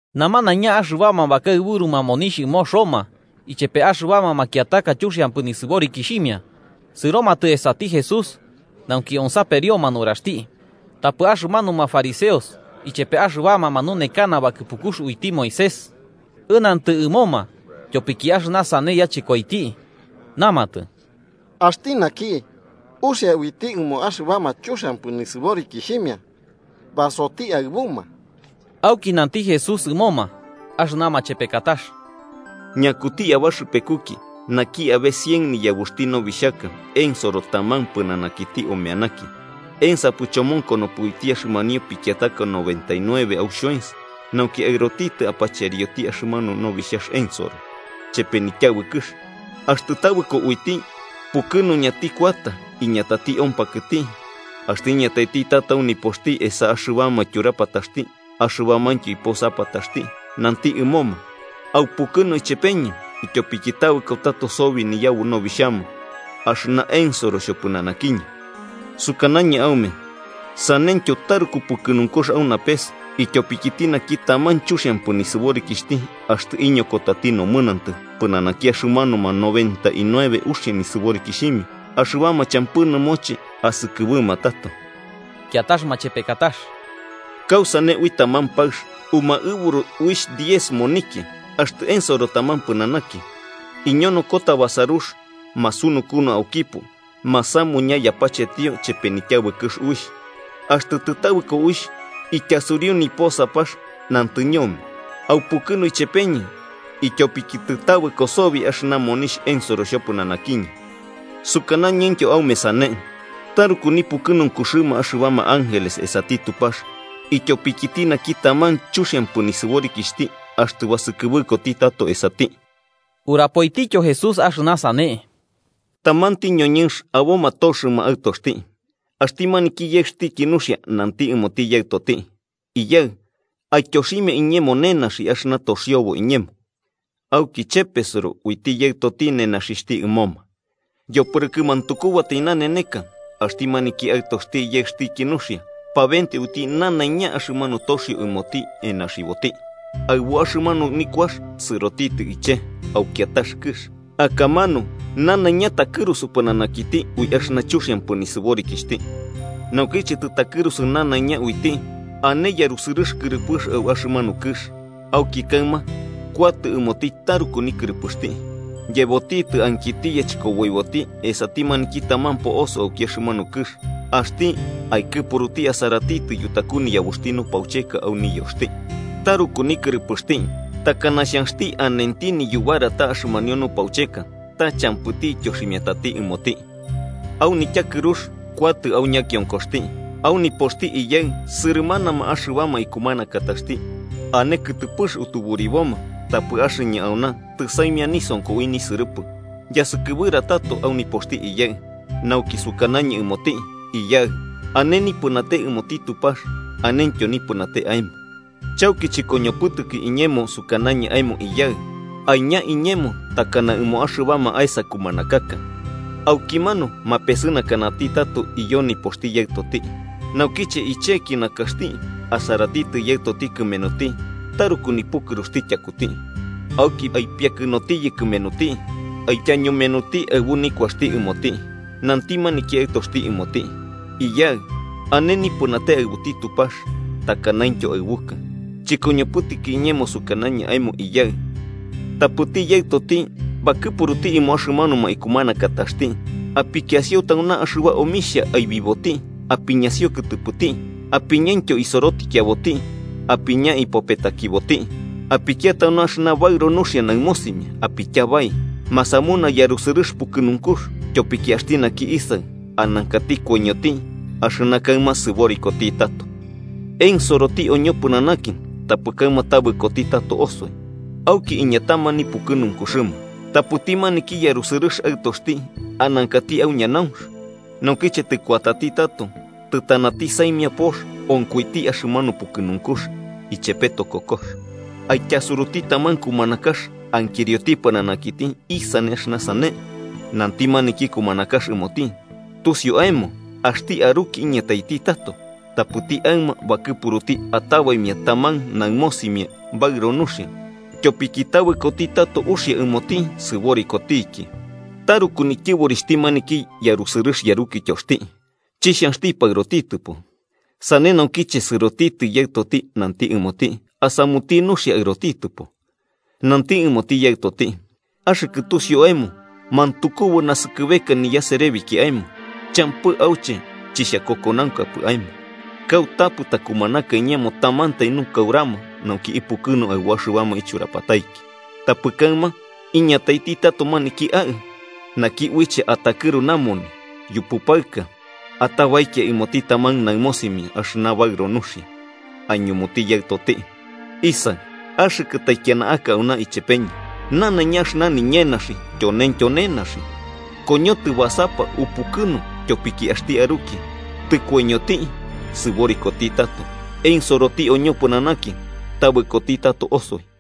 Namanaiña axɨbama bakaɨburuma monixh ɨmo Roma ichepe axɨbama makiataka chuxiampɨ nisɨborikixhimia sɨromatɨ esati Jesús, nauki onsaperioma nuraxti. Tapɨ axɨmanuma fariseos ichepe axɨbama manunekana bakɨpukux uiti Moisés ɨnantɨ ɨmoma tyopiki axɨna sane yachɨkoiti, namatɨ: –Axti naki uxia uiti ɨmo axɨbama chuxiampɨ nisɨborikixhimia basoti aɨbuma. Auki nanti Jesús ɨmoma axɨna machepekatax: “¿Ñakuti abaxɨpekuki, naki abe cien niyabuxti nobixhaka ensoro taman pɨnanakiti omeanaki, ensapɨ chomonkonopɨ uiti axɨmanio pikiataka noventa y nueve au xhoens nauki aɨrotitɨ apacherioti axɨmanu nobixhax ensoro, chepe nityabɨkɨx? Axtɨ tabɨko uiti, pukɨnuñati kuata iñatati ompakɨti, axtɨ iñataiti tato au nipoxti esa axɨbama tyurapataxti axɨbamaintyo iposapataxti, nanti ɨmoma: ‘Aupukɨnu ichepeñɨ, ityopiki tabɨko tato sobi niyabu nobixhama axɨna ensoro xhopɨnanakiñɨ.’ Sukanañɨ aume saneityo taruku pukɨnunkux au napes ityopikiti naki taman chuxiampɨ nisɨborikixhti axtɨ iñokotati nomɨnantɨ pɨnanaki axɨmanuma noventa y nueve uxia nisɨborikixhimia axɨbama champɨ nɨmoche asɨkɨbɨma tato. “Kiatax machepekatax, ¿kausane ui taman paɨx umaɨburu uixh diez monikia axtɨ ensoro taman pɨnanaki, iñonokota basarux masunukunu aukipo masamuña yapachetio ichepe nityabɨkɨx uixh? Axtɨ tɨtabɨko uixh, ityasuriu niposapax, nantɨ ñome: ‘Aupukɨnu ichepeñɨ, ityopiki tɨtabɨko sobi axɨna monixh ensoro xhopɨnanakiñɨ.’ Sukanañɨntyo aume sane nipukɨnunkuxɨma axɨbama ángeles esati Tupax ityopikiti naki taman chuxiampɨ nisɨborikixhti axtɨ basɨkɨbɨkoti tato esati.” Urapoitityo Jesús axɨna sane: “Tamanti ñoñɨnx aboma toxɨma aɨtoxti, axti maniki yaɨxtiki nuxia nanti ɨmoti yaɨtoti: ‘Iyaɨ, aityoximia iñemo nenaxi axɨna toxiobo iñemo.’ Auki chepesɨro uiti yaɨtoti nenaxixhti ɨmoma. Yopɨrɨkɨ mantukubatai nananeka axti maniki aɨtoxti yaɨxtiki nuxia pabenteo uiti nanaiña axɨmanu toxio ɨmoti enaxiboti, aɨbu axɨmanu nikuax sɨrotitɨ iche, au kiatax kɨx, akamanu nanaiña takɨrusu pɨnanakiti ui axɨna chuxiampɨ nisɨborikixhti. Naukiche tɨtakɨrusu nanaiña uiti, ane yarusɨrɨx kɨrɨpɨx au axɨmanu kɨx, auki kaɨma kuatɨ ɨmoti taruku nikɨrɨpɨxti. Yebotitɨ ankiti yachɨkoboiboti esati maniki taman po'oso auki axɨmanu kɨx, axti aikɨpuruti asaratitɨ yutaku niyabuxti nupaucheka au niyoxti. Taruku nikɨrɨpɨxti takana xhanxti anenti niyubarata axɨmanio nupaucheka, ta champɨti ityoximiatati ɨmoti. Au nityakɨrux kuatɨ au ñakionkoxti: ‘¡Au nipoxti iyaɨ sɨrɨmanama axɨbama ikumanakataxti ane kɨtɨpɨx utuburiboma, tapɨ axɨñɨ auna tɨsaimia nisonko ui nisɨrɨpɨ! Yasɨkɨbɨra tato au nipoxti iyaɨ, nauki sukanañɨ ɨmoti: Iyaɨ, ane nipɨnate ɨmoti Tupax anentyo nipɨnate aemo. Chauki chɨkoñopɨtɨki iñemo sukanañɨ aemo iyaɨkɨ. Aiña iñemo takana ɨmo axɨbama aesa kumanakax.’ Aukimanu mapesɨnakanati tato iyo nipoxti yaɨtoti. “Naukiche icheki nakaxti, asaratitɨ yaɨtoti kɨmenuti taruku nipukɨruxti tyakuti. Auki aipiakɨnotiyɨ kɨmenuti, aityañumenoti aɨbu nikuaxti ɨmoti. Nanti maniki aɨtoxti ɨmoti: ‘Iyaɨ, ane nipɨnate aɨbuti Tupax takanaintyo aɨbukɨ. Chɨkoñopɨtɨki iñemo sukanañɨ aemo iyaɨ.’ Tapɨti yaɨtoti bakɨpuruti ɨmo axɨmanuma ikumanakataxti: ‘Apikiasio tauna axɨba omixhia aibiboti apiñasio kɨtɨpɨti. Apiñaintyo isorotikiaboti apiña ipopetakiboti. Apikia tauna axɨna baɨro nuxia naɨmosimia apityabai. ¡Masamuna yarusɨrɨx pukɨnunkux! Tyopiki axti naki isaɨ anankati koiñoti axɨna kaɨma sɨborikoti tato. Ensoroti oñopɨnanaki tapɨ kaɨma tabɨkoti tato osoi.’ Auki iñatama nipukɨnunkuxɨma. “Tapɨti maniki, yarusɨrɨx aɨtoxti anankati au ñanaunx. Naukiche tɨkuatati tato tɨtanati saimia pox, onkoiti axɨmanu pukɨnunkux ichepe tokokox. Aityasuruti taman kumanakax ankirioti pɨnanakiti isane axɨna sane. Nanti maniki kumanakax ɨmoti: ‘Tusiu aemo axti aruki iñataiti tato. Tapɨti aɨma bakɨpuruti atabaimia taman naɨmosimia baɨro nuxia, tyopiki tabɨkoti tato uxia ɨmoti sɨborikotiki.’ Taruku nityɨborixhti maniki yarusɨrɨx yarukityoxti, chixhanxtipɨ aɨrotitɨpo, sane naukiche sɨrotitɨ yaɨtoti nanti ɨmoti asamuti nuxia aɨrotitɨpo. Nanti ɨmoti yaɨtoti: ‘Axɨkɨ tusiu aemo mantukubu naskɨbeka niyaserebiki aemo, champɨ auche chixhakokonaunkapɨ aemo, kautapɨ takumanaka iñemo tamantai nukaurama nauki ipukɨnu aɨbu axɨbama ichurapataiki. Tapɨ kaɨma, iñataiti tato maniki aaɨ, naki uiche atakɨru namoni yupu paɨka, atabaikia ɨmoti taman naɨmosimia axɨna baɨro nuxia.’ “Aiñumuti yaɨtoti: ‘Isaɨ, axɨkɨ taikiana aka auna ichepeñɨ, nanaiña axɨna niñenaxi tyoneintyo nenaxi. Koñotɨ basapa upukɨnu, tyopiki axti aruki, tɨkoiñoti, sɨborikoti tato. Ensoroti oñopɨnanaki tabɨkoti tato osoi.’”